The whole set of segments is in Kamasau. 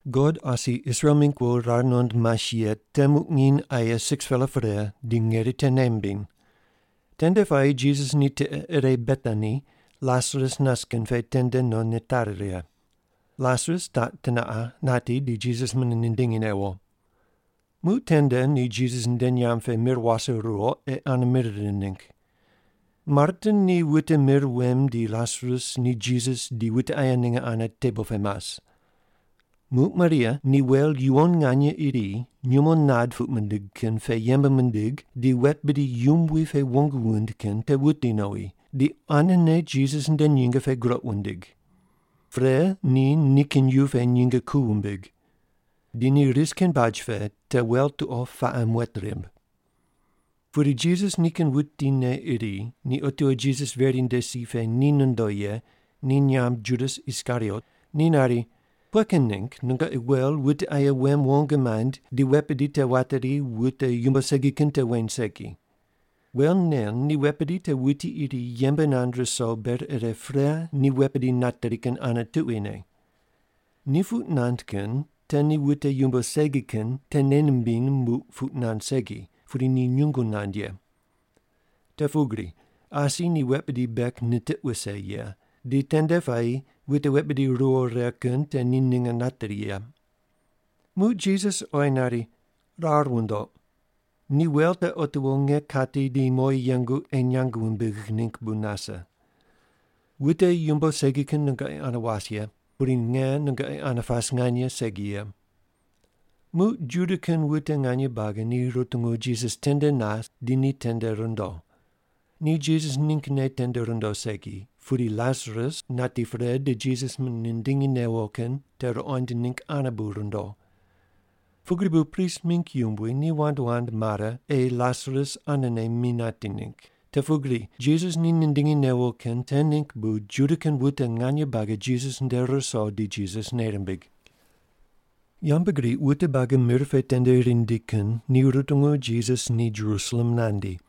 God asi Israel mingg wo rar nuqond mas ye te muq nginy aye 6-pela pre di ngeri te nei mimbiny. Tende puayi Jisas ni tiqe ire Betani, Lasarus nas kin pe tende no nitari righe. Lasarus taq teneqa nati di Jisas mune nindingi newo. Muq tende ni Jisas nde nyamb pe mir wase ruwo ei ane mir rind ningg. Marta ni wute mir wem di Lasarus ni Jisas di wute aye ninge ane tebol pe mas. Muq Maria ni wel yuwon nganye iri nyumo nad puq mindig kin pe yembe mindig di wet bidi yumbui pe wong wuind kin te wuti nowi, di quanene Jisas nde nyinge pe groq wundig. Pre, ni nikin yu pe nyinge ku wumbig. Di ni ris kin baj pe te wel tuqo paqe muet rimb. Pudi Jisas nikin wutine iri ni otiwo Jisas veri nde si pe ni nondo ye, ni nyamb Judas Iskariot, ni nari, “Pughe kin ningg nungoqi wel wute aye wem wong maind di wet bidi te wateri wute yumbo segi kin te weny segi? Wel nen ni wet bidi te wuti iri yembe nand ruso ber ire pre ni wet bidi nateri kin ane tuquine.” Ni puq nand kin te ni wute yumbo segi kin te nei nimbiny muq puq nand segi, pudi ni nyungu nand ye. Te pugri asi ni wet bidi bek nitiq wuse ye, di tende puayi wute wet bidi ruwo righe kin te ni ninge nateri ye. Muq Jisas oyi nari, “Rar wundoq, ni wel te otiwo nge kati di mowi yengu ei nyang wumbigh ningg bu nase. Wute yumbo segi kin nungoqi ane was ye, pudi nge nungoqi ane pas nganye segi ye.” Muq Juda kin wute nganye buagi ni rutungu Jisas tende nas di ni tende rundo. Ni Jisas ninggne tende rundo segi, pudi Lasarus nati pre di Jisas mune nindingi newo kin te ruqoind ningg ane bu rundo. Pugri bu prist mingg yumbui ni wand wand mare, ei Lasarus anene mi nati ningg, te pugri Jisas ni nindingi newo kin te ningg bu Juda kin wute nganye buagi Jisas nde ruso di Jisas nei rimbig. Yambgriq wute buagi mir pe tende rindi kin ni rutungu Jisas ni Jerusalem nandi.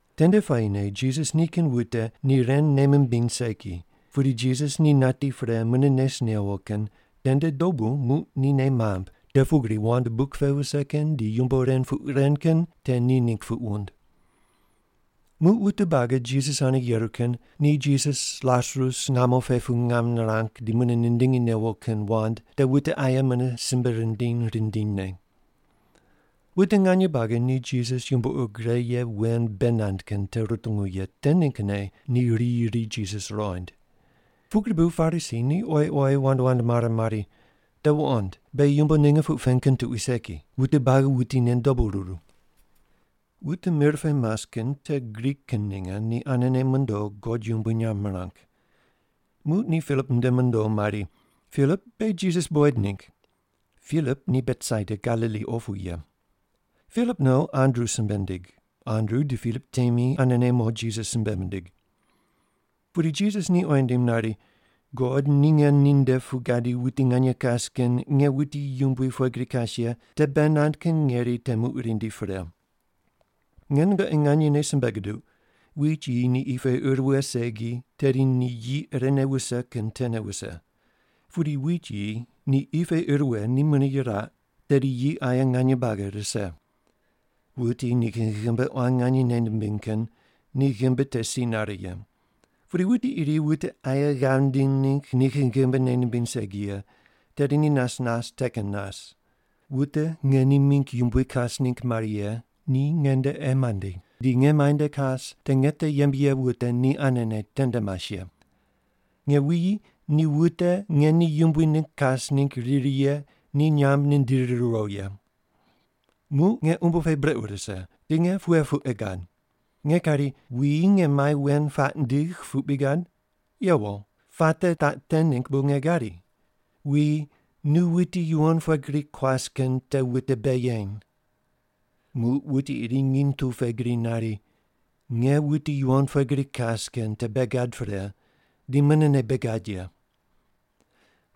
Tende puayine Jisas nikin wute ni ren nei mimbiny segi, pudi Jisas ni nati pre mune nes newo kin tende dobu muq ni nei mamb te pugri wand buk pe vise kin di yumbo ren puq ren kin te ni ningg puq wund. Muq wute buagi Jisas ane yeru kin ni Jisas Lasarus ngamo pe pu ngam nirang di mune nindingi newo kin wand te wute aye mune simbe rindiny rindinyne. Wute nganye buagi ni Jisas yumbo ur gre ye wen bei nand kin te rutungu ye te ninggne ni riyi ri Jisas ruqoind. Pugri bu Parisi ni oyi oyi wand wand mare mari, “Te wuqond, beghi yumbo ninge puq pen kin tuqui segi. Wute buagi wuti tende dobu ruru!” Wute mir pe mas kin te Grik kin ninge ni anene mondo God yumbui nyamb mirang. Muq ni Pilip nde mondo mari, “Pilip, beghi Jisas buqoid ningg.” (Pilip ni Betsaida, Galili opu ye.) Pilip no Andru simbe nindig. Andru di Pilip temi anene mo Jisas simbe mindig. Pudi Jisas ni oyi nindim nari, “God ni nge ninde pu gadi wuti nganye kas kin nge wuti yumbui pughe gri kas ye te bei nand kin ngeri te muq rindi pre. Nge nungoqi nganyene simbe guduq, wit yi ni qi pe ir wughe segi, tedi ni yi irene wuse kin tene wuse. Pudi wit yi ni qi pe ir wughe ni mune yiraq, tedi yi aye nganye buagi rise. Wuti nikin ghimbi quan nganye nei nimbiny kin, ni ghimbi te si nare ye. Pudi wuti iri wute aye ghav nindiny ningg nikin ghimbi nei nimbiny segi ye, tedi ni nas nas te kin nas. Wute nge ni mingg yumbui kas ningg mari ye, ni ngende ei mandi, di nge muainde kas te nge te yembe ye wute ni anene tende mas ye. Nge wuyi ni wute nge ni yumbui ningg kas ningg riri ye ni nyamb nindiri riwo ye. “Muq nge umbo pe brequ rise, di nge pughe puq ei gad? Nge kari, ‘Wuyi nge mai wen puaq ndigh,’ puq bri gad? Yewo. Puate taq te ningg bu nge gadi. Wuyi, nu wuti yuwon pughe gri kuas kin te wute bei yeny!” Muq wuti iri nginy tu pe gri nari, “Nge wuti yuwon pughe gri kas kin te bei gad pre, di munene bei gad ye.”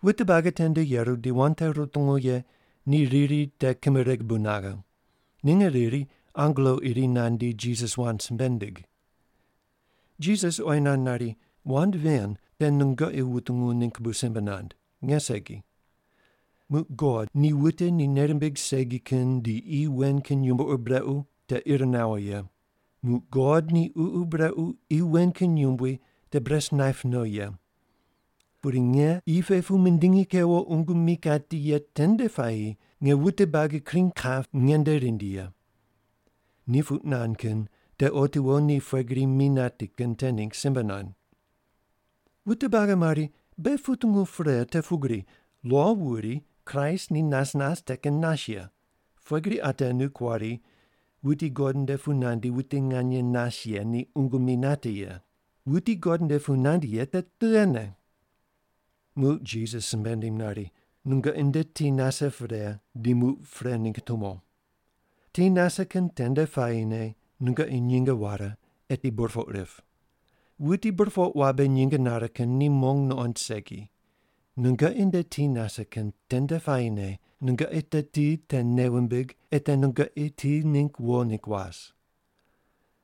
Wute buagi tende yeru di wand te rutungu ye ni riri te kimereg bu naghe. Ninge riri angelo iri nandi, Jisas wand simbe nindig. Jisas oyi nand nari, “Wand ven te nungoqi wutungu ningg bu simbe nand, nge segi. Muq God ni wute ni nei rimbig segi kin di qi wen kin yumbo ur brequ te ir nawo ye. Muq God ni ququ brequ qi wen kin yumbui te bures naip no ye. Pudi nge qi pe pu mindingi kewo qungu mi kati ye tende puayi nge wute buagi kring kap nge nde rindi ye.” Ni puq nand kin te otiwo ni pughe gri mi nati kin te ningg simbe nand. Wute buagi mari, “Beghi putungu pre te pugri lo wuri Kraist ni nas nas te kin nas ye, pughe gri ate nu kuari, ‘Wuti God nde pu nandi wuti nganye nas ye ni qungu mi nati ye’? Wuti God nde pu nandi ye te tughene?” Muq Jisas simbe nindim nari, “Nungoqi nde ti nase pre di muq pre ningg tumo. Ti nase kin tende puayine nungoqi nyinge ware, eti burpoq rip. Wuti burpoq wabe nyinge nare kin ni mong nuqond segi. Nungoqi nde ti nase kin tende puayine nungoqi te ti te nei wumbig ei te nungoqi ti ningg wo ningg was.”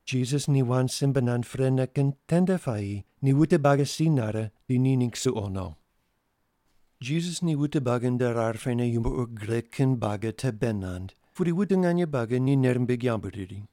Jisas ni wand simbe nand prene kin tende puayi ni wute buagi si nare di ni ningg suqo no. Jisas ni wute buagi nde rar pene yumbo ur gre kin buagi te bei nand, pudi wute nganye buagi ni nei rimbig yambu riri.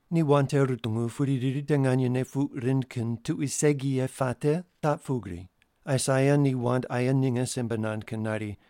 Ni wand te rutungu pudi riri te nganyene puq rind kin tuqui segi ye puate taq pugri, Aisaia ni wand aye ninge simbe nand kin nari,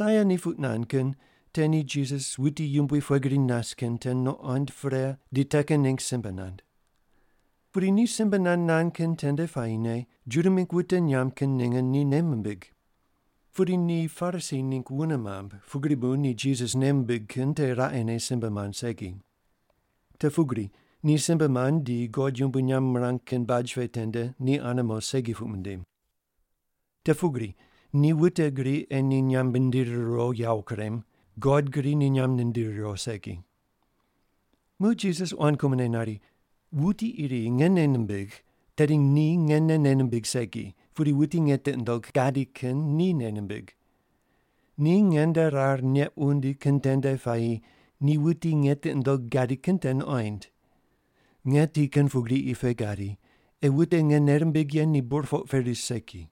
Aisaia ni puq nand kin te ni Jisas wuti yumbui pughe gri nas kin te nuqond pre di te kin ningg simbe nand. Pudi ni simbe nand nand kin tende puayine Juda mingg wute nyamb kin ninge ni nei mimbig. Pudi ni Parisi ningg wune mamb, pugri bu ni Jisas nei mimbig kin te raqene simbe mand segi. Te pugri ni simbe mand di God yumbui nyamb mirang kin baj pe tende ni ane mo segi puq mindim. Te pugri ni wute gri ei ni nyamb mindiri riwo yawo kurem, God gri ni nyamb nindiri riwo segi. Muq Jisas quan kumone nari, “Wuti iri nge nei nimbigh, tedi ni ngene nei nimbigh segi, pudi wuti nge tiqi nundogh gadi kin ni nei nimbig. Ni nge nde rar neq wundi kin tende puayi ni wuti nge tiqi nundogh gadi kin te nuqoind. Nge ti kin pugri qi pe gadi, ei wute nge nei rimbigh ye ni burpoq pe ris segi.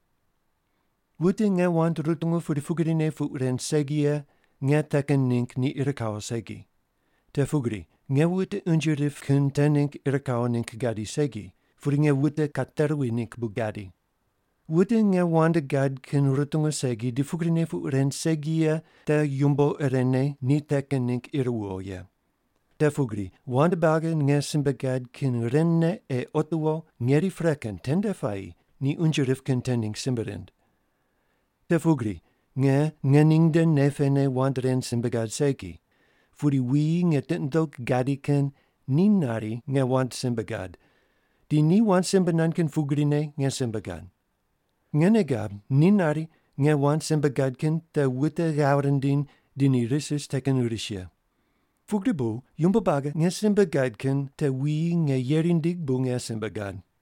“Wute nge wand rutungu pudi pugrine puq ren segi ye, nge te kin ningg ni ir kawo segi. Te pugri nge wute unje rip kin te ningg ir kawo ningg gadi segi, pudi nge wute kateruwi ningg bu gadi. Wute nge wand gad kin rutungu segi di pugrine puq ren segi ye te yumbo irene ni te kin ningg ir wuwo ye. Te pugri wand buagi nge simbe gad kin ren ne ei otiwo ngeri pre kin tende puayi ni unje rip kin te ningg simbe rind. Te pugri nge ngening nde nei pene wand ren simbe gad segi, pudi wuyi nge tiqi nundogh gadi kin ni nari nge wand simbe gad, di ni wand simbe nand kin pugrine nge simbe gad. Nge nei gab ni nari nge wand simbe gad kin te wute ghav rindiny di ni ris ris te kin ris ye. Pugri bu yumbo buagi nge simbe gad kin te wuyi nge yeri nindigh bu nge simbe gad.”